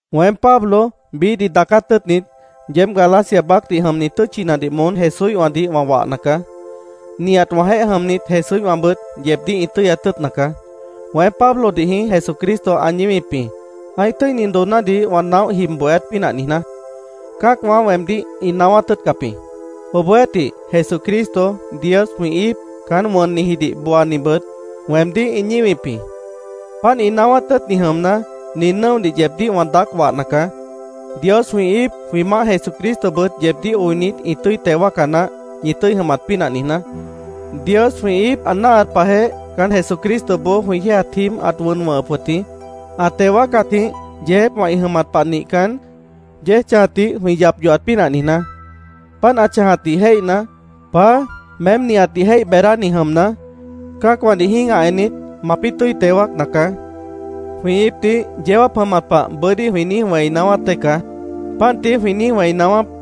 Weém, Pablo, biíhdih daacát tʉ́ʉtnit, yeéb Galacia baácdih jʉmni tʉ́tchinadih moón Jesúíhwãdih wã wahna caá. Nihat wãjeéh jʉmnit Jesúíhwãbʉt yeebdíh ĩ tʉ́yat tʉ́ʉtna caá. Weém, Pablodih jĩí Jesucristo ã ñíwip jĩ, ã́ih tʉ́ini doonádih wã naóh jib bohéát pínah niijná. Cã́acwã weemdíh ĩ naáwát tʉ́ʉtcap jĩ. Obohjeéhtih, Jesucristo, Dios jwĩ íip caán wʉnnijidih booanibʉt weemdíh ĩ ñíwip jĩ. Páant ĩ naáwát tʉ́ʉtni jʉmna, nin nʉ́odih yeebdíh wã daác wahna caá. Dios jwĩ íip, jwĩ Maáh Jesucristobʉt yeebdíh oinit, ĩ tʉ́i teo wáaca naáh, ñi tʉ́i jʉmat pínah niijná. Dios jwĩ íip ã náahat pahjeh, caán Jesucristoboó jwĩ yéejat jíib, ãt wʉn wʉ̃hʉp wʉt jĩ, ã teo wáacatjĩh yeejépwã ĩ jʉmat pah nihcan, yéej chãjatdih jwĩ yap yohat pínah niijná. Páant ã chãjatdih jéihna, “Paá, meém nihatdih jéih beedáni jʉmna, cã́acwãdih jĩ́gah ennit, mapĩ́ tʉ́i teo wáacna caá”, jwĩ íipdih yeó jáap jʉmat pah bʉ́dí jwĩ niíj wẽi naáwát dée caá. Páant tií jwĩ niíj wẽi naáwáp.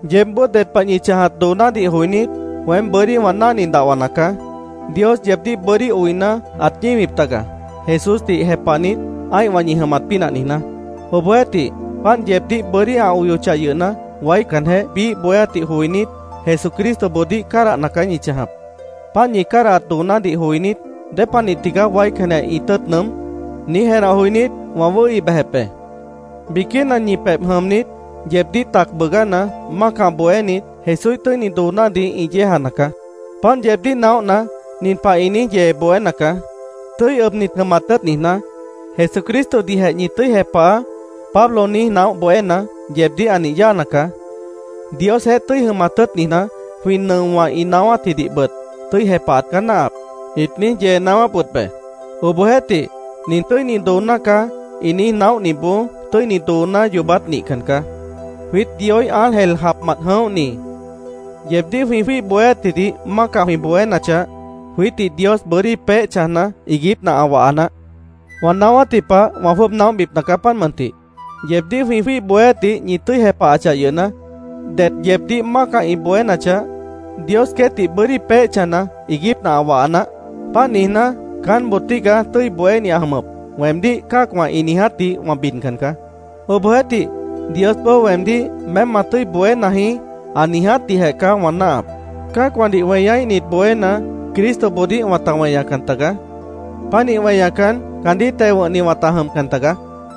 Yeébboó ded pah ñi chãjat doonádih joinít, weém bʉ́dí wã náhni dahwana caá. Dios yeebdíh bʉ́dí oina, ãt ñíwip taga, Jesúsdih jepahnit, ã́ihwã ñi jʉmat pínah niijná. Obohjeéhtih, páant yeebdíh bʉ́dí ã oyochah yʉhna, waícanjeh biíh bohéátdih joinít, Jesucristoboodíh cádahna caá ñi chãjap. Páant ñi cádahat doonádih joinít, “¿Dépanih tigaá waícanjeh ĩ tʉ́ʉt nʉʉ́m?” niíj jenah joinít, wã wʉ́hi bejep be. Biquína ñi pebh jʉmnit, yeebdíh tac bʉʉgána, mácah bohénit, Jesúíh tʉ́ini doonádih ĩ yéejana caá. Páant yeebdíh naóhna, nin pah ĩ niíj yee bohéna caá: “ ‘Tʉ́i ʉbnit jʉmat tʉ́ʉt niijná, Jesucristodihjeh ñi tʉ́i jepahaá’, Pablo niíj naóh bohéna, yeebdíh ã nih yáana caá. Diosjeéh tʉ́i jʉmat tʉ́ʉt niijná, jwĩ nʉowã ĩ naáwátjidihbʉt tʉ́i jepahat caá náahap”, ĩt niíj yee naáwáp wʉt be. Obohjeéhtih, “Nin tʉ́ini dooná caá”, ĩ niíj naóhniboó tʉ́ini dooná yoobát nihcan caá. Jwiít, Dioíh ángel japmant jʉ̃óhni, yeebdíh jwĩ jwíih bohéátjidih mácah jwĩ bohénachah, jwiítdih Dios bʉ́dí peéh chãjna, iiguípna ã waha naáh. Wã naáwátji pah wã jwʉ́ʉb naóhbipna caá, páant mʉntih: Yeebdíh jwĩ jwíih bohéátdih ñi tʉ́i jepahachah yʉhna, det yeebdíh mácah ĩ bohénachah, Dios queétdih bʉ́dí peéh chãjna, iiguípna ã waha naáh. Páant niijná, “Caánboo tígaá tʉ́i bohéni ã jʉmʉp”, weemdíh cã́acwã ĩ niijátdih wã bidcan caá. Obohjeéhtih, Diosboó weemdíh “Meém ma tʉ́i bohéna jĩí”, ã niijátdihjeh caá wã náahap. Cã́acwãdih weñaíhnit bohéna, Cristoboodíh wãta weñacan tagaá. Pánih weñacan, caandíh teo wʉ̃hni wãta jʉmcan taga.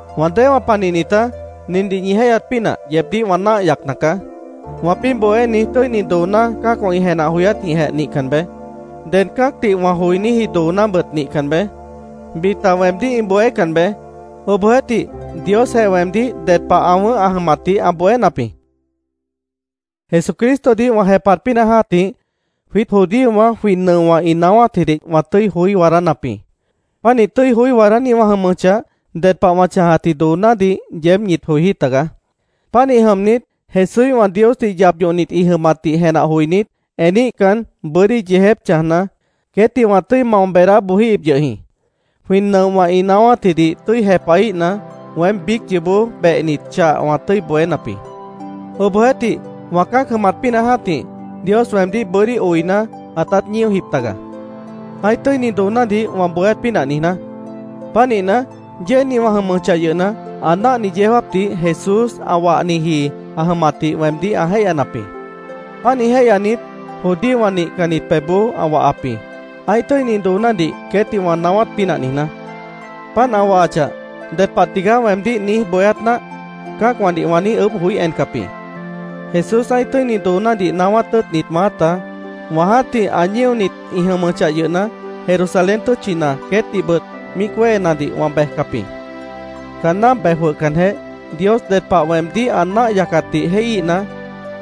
Wã déewã panihnitá, nindih ñi jéihyat pínah yeebdíh wã náah yacna caá: Wãpĩ́ bohéni tʉ́ini dooná cã́acwã ĩ jenah joyátjijeh nihcan beé. Ded cã́acdih wã joiníji doonábʉt nihcan beé. Bita weemdíh ĩ bohécan beé. Obohjeéhtih, Diosjeh weemdíh ded pah ã wʉ̃ʉ́h ã jʉmatdih ã bohénap jĩ. Jesucristodih wã jepahat pínah jã́tih, jwiít judíowã jwĩ nʉowã ĩ naáwátjidih wã tʉ́i joí waadánap jĩ. Pánih tʉ́i joí waadáni wã jʉmʉchah, ded pah wã chãjatji doonádih yeéb ñit joijí tagaá. Pánih jʉmnit, Jesúíhwã Diosdih yap yohnit ĩ jʉmatdih jenah joinít, eníhcan, bʉ́dí yeejép chãjna, queétdih wã tʉ́i mao beedá bojíhip yʉh jĩ. Jwĩ nʉowã ĩ naáwátjidih tʉ́i jepahíhna, weém biíc yoobó behnit chah wã tʉ́i bohénap jĩ. Obohjeéhtih, wã cã́ac jʉmat pínah jã́tih, Dios weemdíh bʉ́dí oina, ãtát ñíojip taga, ã́ih tʉ́ini doonádih wã bohéát pínah niijná. Pánihna, yéejni wã jʉmʉchah yʉhna, ã náahni yeó jáapdih Jesús ã wahniji ã jʉmatdih weemdíh ã jéihyanap jĩ. Pánih jéihyanit, judíowã nihcannit pebhboó ã wahap jĩ, ã́ih tʉ́ini doonádih queétdih wã naáwát pínah niijná. Páant ã wahachah, “¿Ded pah tigaá weemdíh niíj bohéát náah?” cã́acwãdih wã niíj ʉʉ́bh joí encap jĩ. Jesús ã́ih tʉ́ini doonádih naáwát tʉ́ʉtnit maáta, wã jã́tih ã ñíonit ĩ jʉmʉchah yʉhna, Jerusalén tʉ́tchina queétdihbʉt míic wéhenadih wã bejcap jĩ. Caanná bej jwʉhcanjeh, Dios ded pah weemdíh ã náah yacatdih jéihíhna,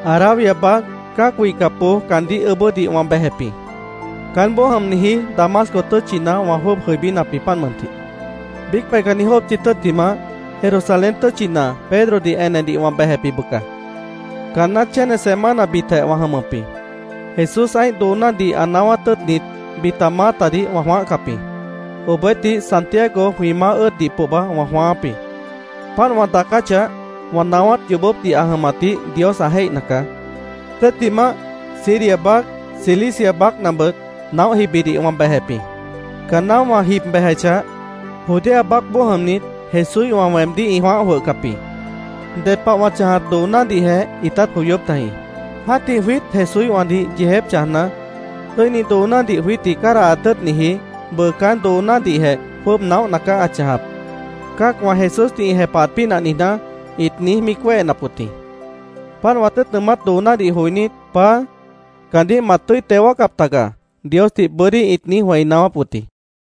Arabia baác cã́ac wihcapboó caandíh ʉʉ́bʉ́dih wã bejep jĩ. Caánboó jʉmniji Damasco tʉ́tchina wã jwʉ́ʉb jʉibínap jĩ, páant mʉntih. Biíc peihcanni jópchi tʉ́ttimah, Jerusalén tʉ́tchina Pedrodih enedih wã bejep jĩ bʉca. Caanná chéne semanabitjeh wã jʉmʉp jĩ. Jesús ã́ih doonádih ã naáwát tʉ́ʉtnit bita maátadih wã jwãáhcap jĩ. Obohjeéhtih, Santiago jwĩ Maáh ʉ́ʉddih pohba wã jwãááp jĩ. Páant wã daacáchah, wã naáwát yoobópdih ã jʉmatdih Dios ã jéihna caá. Tʉ́ttimah, Siria baác, Cilicia baácnabʉt naóh jibidih wã bejep jĩ. Caanná wã jib bejechah, Judea baácboó jʉmnit Jesúíhwã weemdíh ĩ jwãáh jwʉhcap jĩ. Ded pah wã chãjat doonádihjeh ĩtát joyóp tajĩ. “Jã́tih jwiít Jesúíhwãdih yeejép chãjna, tʉ́ini doonádih jwiítdih cádahat tʉ́ʉtniji bʉʉ caán doonádihjeh jwʉ́ʉb naóhna caá ã chãjap, cã́acwã Jesúsdih ĩ jepahat pínah niijná”, ĩt niíj míic wéhenap wʉt jĩ. Páant wã tʉ́ʉt nʉʉmát doonádih joinít, “Paá, caandíh mat tʉ́i teo wáacap taga”, Diosdih bʉ́dí ĩt niíj wẽi naáwáp wʉt jĩ.